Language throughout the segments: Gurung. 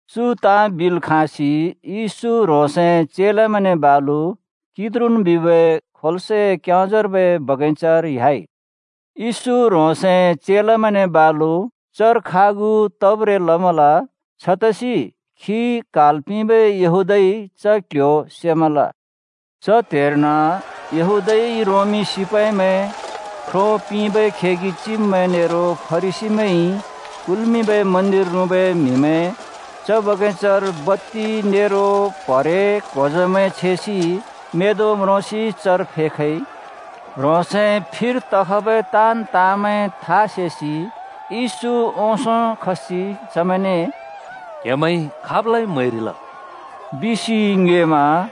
चु ताँ बिल् खाँसि येशू ह्रोंसए चेलामैंने बालु किद्रोन बिबै खोल्सए क्योंजार्बै बगैंचार ह्‍याइ। येशू ह्रोंसए चेलामैंने बालु चर खागु तब्रें लमल, छतसि खी क्हाल् पिंबै येहूदाइ च क्ल्ह्‍यो सेमल। च त्हेर्न यहूदाइ रोमी सिपाइमैं ख्रो पिंबै खेगि चिब्मैं नेरो फरिसीमैंइ कुल्मिंबै मन्दिर रुँबै म्हिमैं च बगैंचार बत्ति नेरो प्हरे-क्होजमैं छेसि मेंदों म्रोसि चर फेखइ। ह्रोंसए फिर तखबै ताँन् ताँमैं था सेसि येशू ओंसों खसि चमैंने “क्हेमैंइ खाबलाइ म्‍हैरिल?” बिसि ङ्योएमा।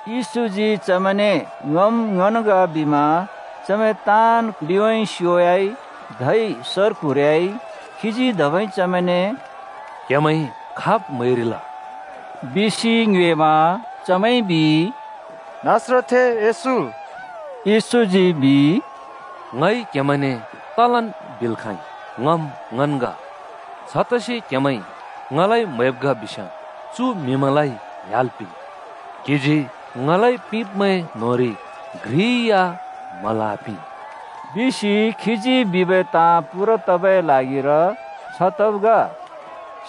येशूजी चमैंने “ङम् ङन् ग” बिमा चमैं ताँन् लिउँइँ स्योयाइ धै सर क्हुरियाइ। खीजी धबै चमैंने “क्‍हेमैंइ खाब् म्‍हैरिल?” बिसि ङ्योएमा चमैंइ बिइ, “नासरतथें येशू।” येशूजी बिइ, “ङइ क्हेमैंने तलन् बिल् खाँइ, ङम् ङन् ग। छतसि क्हेमैंइ ङलाइ म्हैब् ग बिस्याँ चु म्हिमैंलाइ ह्‍याल् पिंन्।” “क्हिजी ङलाइ पिंब्मैं न्होंरि घ्रि या म्हल् आपिं” बिसि खीजी बिबै ताँ पूरा तबै ल्हागिर छ तब् ग।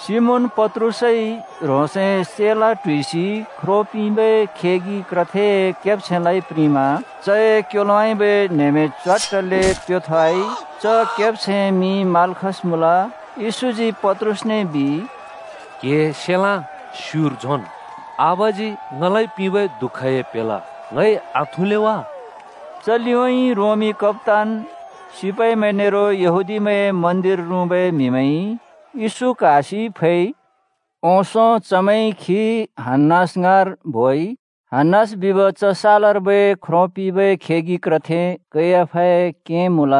सिमोन पत्रुसइ ह्रोंसए सेलाँ (तरवार) ट्हुइसि ख्रो पिंबै खेगि क्रथेए केब्छैंलाइ प्रिंमा चए क्योलोउँइँबै न्हेमें च्वाट्टले प्‍योथोवाइ। च केब्छैंए मिं माल्खस मुँल। येशूजी पत्रुसने बिइ, “क्‍हिए सेलाँ स्युर झोंन्। आबाजी ङलाइ पिंबै दुःखए प्हेला ङइ आथुँले वा?” च लिउँइँ रोमी कप्‍तान, सिपाइमैं नेरो यहूदीमैंए मन्दिर रुँबै म्हिमैंइ येशू क्हासि फैइ। ओंसों चमैंइ खी हन्‍नास ङाँर बोइ। हन्‍नास बिब च सालर्बै ख्रो पिंबै खेगि क्रथे कैयाफाए क्यें मुँल।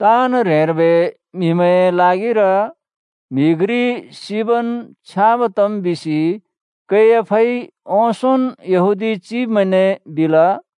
“ताँन् ह्रेंर्बै म्हिमैंए ल्हागिर म्हि घ्रि सिबन् छ्याँब तम् बिसि कैयाफाइ ओंसोंन् यहूदी चिब्मैंने बिल।”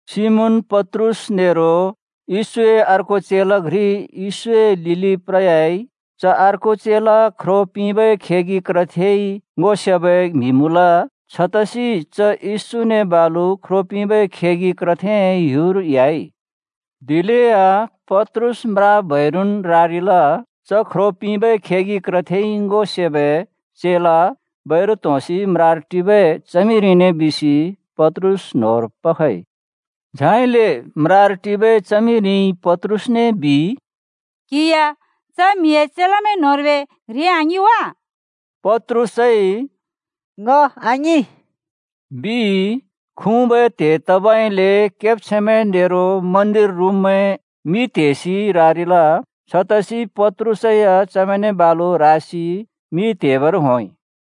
सिमोन पत्रुस नेरो येशूए अर्को चेला घ्रि येशूए लिलि प्रयाइ। च अर्को चेला ख्रो पिंबै खेगि क्रथेइ ङो सेबै म्हि मुँल। छतसि च येशूने बालु ख्रो पिंबै खेगि क्रथेए ह्‍युर ह्‍याइ। दिलेया पत्रुस म्रा बैरुन् रारिल। च ख्रो पिंबै खेगि क्रथेइ ङो सेबै चेला बैरु त्होंसि म्रार टिबै च्हमिरिने बिसि पत्रुस न्होंर पखइ। झाइले म्रार टिबै च्हमिरिइ पत्रुसने बिइ, “क्हि या च म्हिए चेलामैं न्होंर्बै घ्रि आङिं वा?” पत्रुसइ “ङ आङिं,” बिइ। खुँबै त्हे तबइले केब्छैंमैं नेरो मन्दिर रुँब्मैं मि त्हेसि रारिल। छतसि पत्रुस या चमैंने बालु रासि मि त्हेबर होंइ।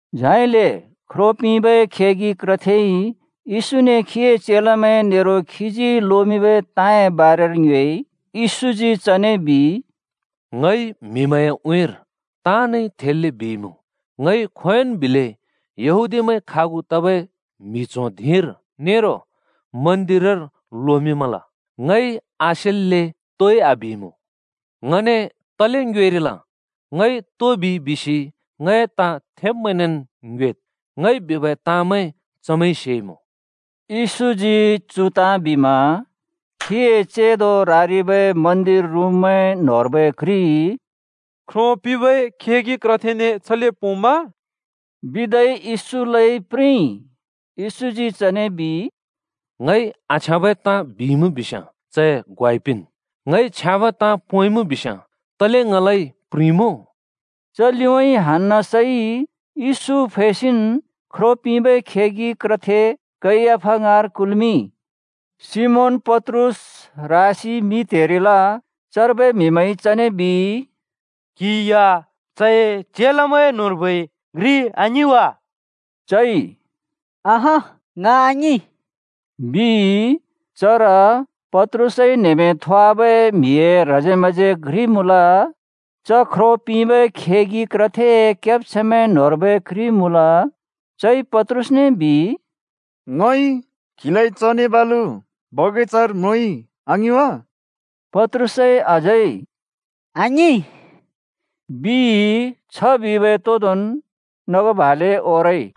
झाइले ख्रो पिंबै खेगि क्रथेइ येशूने खीए चेलामैं नेरो खीजी लोमिंबै ताँए बारेर ङ्योएइ। येशूजी चने बिइ, “ङइ म्हिमैंए उँइँर ताँनइ थेल्‍ले बिइमुँ। ङइ खोंयोंन् बिलै यहूदीमैं खागु तबै म्हि च्हों धिंर नेरो मन्दिरर लोमिंमल। ङइ आसेल्‍ले तोइ आबिइमुँ। ङने तले ङ्योएरिल? ङइ तो बिइ बिसि ङए ताँ थेब्मैंनेन् ङ्योएद्। ङइ बिबै ताँमैं चमैंइ सेइमुँ।” येशूजी चु ताँ बिमा खीए चेंदो रारिबै मन्दिर रुँब्मैं न्होंर्बै घ्रिइ “ख्रो पिंबै खेगि क्रथेने छले पोंम्मा?” बिदै येशूलाइ प्रिंइ। येशूजी चने बिइ, “ङइ आछ्याँबै ताँ बिइमुँ बिस्याँ चए ग्वाइ पिंन्। ङइ छ्याँब ताँ पोंइमुँ बिस्याँ तले ङलाइ प्रिंमुँ?” च लिउँइँ हन्‍नासइ येशू फैसिन् ख्रो पिंबै खेगि क्रथे कैयाफा ङाँर कुल्मिंइ। सिमोन पत्रुस रासि मि त्‍हेरिल। चर्बै म्हिमैंइ चने बिइ, “क्हि या चए चेलामैं न्होंर्बै घ्रि आङिं वा?” चइ “अँहँ, ङ आङिं,” बिइ। चर पत्रुसइ न्हेमें थोवाबै म्हिए ह्रजे म्हजे घ्रि मुँल। च ख्रो पिंबै खेगि क्रथेए केब्छैंमैं न्होंर्बै घ्रि मुँल। चइ पत्रुसने बिइ, “ङइ क्हिलाइ चने बालु बगैंचार म्रोंइ आङिं वा?” पत्रुसइ अझै “आङिं!” बिइ। छ बिबै तोंदोंन् नग भाले ओरइ।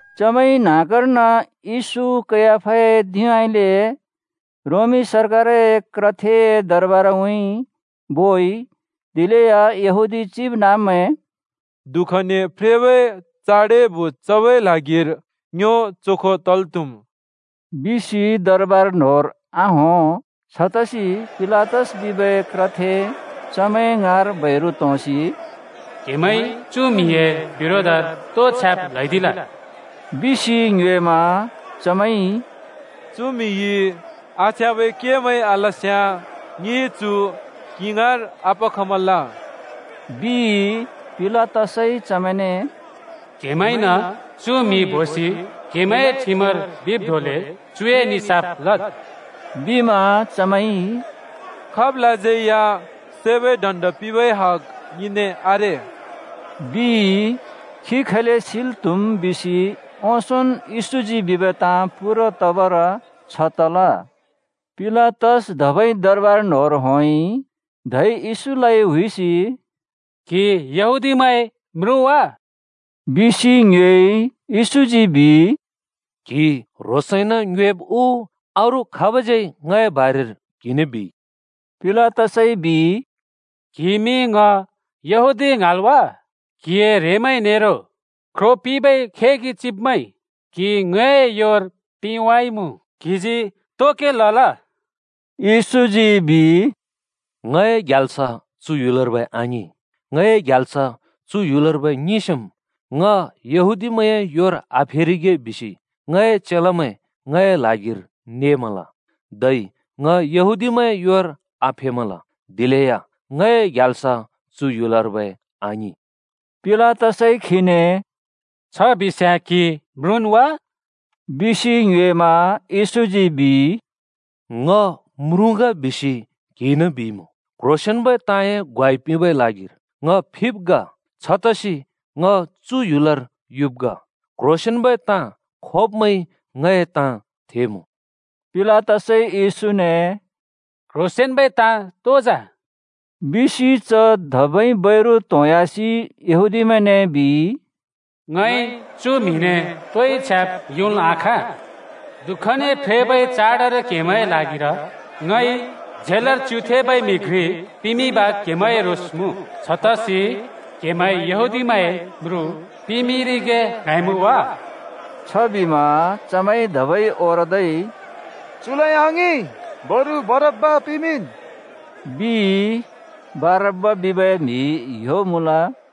चमैंइ न्हाँगर्न येशू कैयाफाए धिंउँइँले रोमी सरकारए क्रथेए दरबारउँइँ बोइ। दिलेया यहूदी चिबनाँब्मैं “दुःखने फ्रेबै चाडए भोज चबै ल्हागिर ङ्यो चोखो तल् त्हुम्,” बिसि दरबार न्होंर आहों। छतसि पिलातस बिबै क्रथे चमैं ङाँर बैरु त्होंसि “क्‍हेमैंइ चु म्हिए बिरोधर तो छ्याब् ल्हैदिल?” बिसि ङ्योएमा चमैंइ “चु म्हिइ आछ्याँबै केमैं आलस्याँ ङिइ चु क्‍हि ङाँर आपखमल,” बिइ। पिलातसइ चमैंने “क्‍हेमैंइन चु म्हि बोसि क्हेमैंए ठिमर बिब् धोंले चुए निसाफ लद्,” बिमा चमैंइ, “खाबलाज्यै या सैबै दण्ड पिंबै हग ङिने आरे,” बिइ। (खी खैले सिल् त्‍हुम् बिसि ओंसोंन् येशूजी बिबै ताँ पूरा तबर छ तला।) पिलातस धबै दरबार न्‍होंर होंइ, धै येशूलाइ हुइसि “क्हि येहूदिमैंए म्रुँ वा?” बिसि ङ्योएइ। येशूजी बिइ, “क्हि ह्रोंसइन ङ्योएब् उ अरू खाबज्यै ङए बारेर क्हिने बिइ?” पिलातसइ बिइ, “क्हिइमि ङ यहूदी ङ्हाँल् वा? क्‍हिए ह्रेंमैं नेरो ख्रो पिंबै खेगि चिब्मैंइ क्‍हि ङए योर पिंवाइमुँ। क्हिजी तो के लल?” येशूजी बिइ, “ङए ग्याल्स चु ह्‍युलर्बै आङिं। ङए ग्याल्स चु ह्‍युलर्बै ङिंस्याँम् ङ येहूदिमैंए योर आफेरिगे बिसि ङए चेलामैं ङए ल्हागिर नेमल। धै ङ यहूदीमैंए योर आफेमल। दिलेया ङए ग्याल्स चु ह्‍युलर्बै आङिं।” पिलाताइ खीने “छ बिस्याँ क्हि म्रुँन् वा?” बिसि ङ्योएमा येशूजी बिइ, “ङ म्रुँ ग बिसि क्‍हिइन बिइमुँ। क्‍ह्रोंसेंन्‍बै ताँए ग्वाइ पिंबै ल्हागिर ङ फिब् ग। छतसि ङ चु ह्‍युलर युब् ग। क्ह्रोंसेंन्बै ताँ खोब्मैंइ ङए ताँ थेमुँ।” पिलातसइ येशूने “क्‍ह्रोंसेंन्‍बै ताँ तो जा?” बिसि च धबै बैरु त्होंह्‍यासि येहूदिमैंने बिइ, “ङइ चु म्हिने तोइ छ्याब् योंल् आखाँ। दुःखने फ्रेबै चाडर क्हेमैंए ल्हागिर ङइ झेलर च्युथेंबै म्हि घ्रि पिमिंब क्हेमैंए रोस मुँ। छतसि क्हेमैंइ यहूदीमैंए म्रुँ पिमिंरिगे ङ्हाँइमुँ वा?” छबिमा चमैंइ धबै ओरदै “चु आङिं, बरु बरब्‍बा पिमिंन्,” बिइ। (बरब्‍बा बिबै म्हि ह्‍यो मुँल।)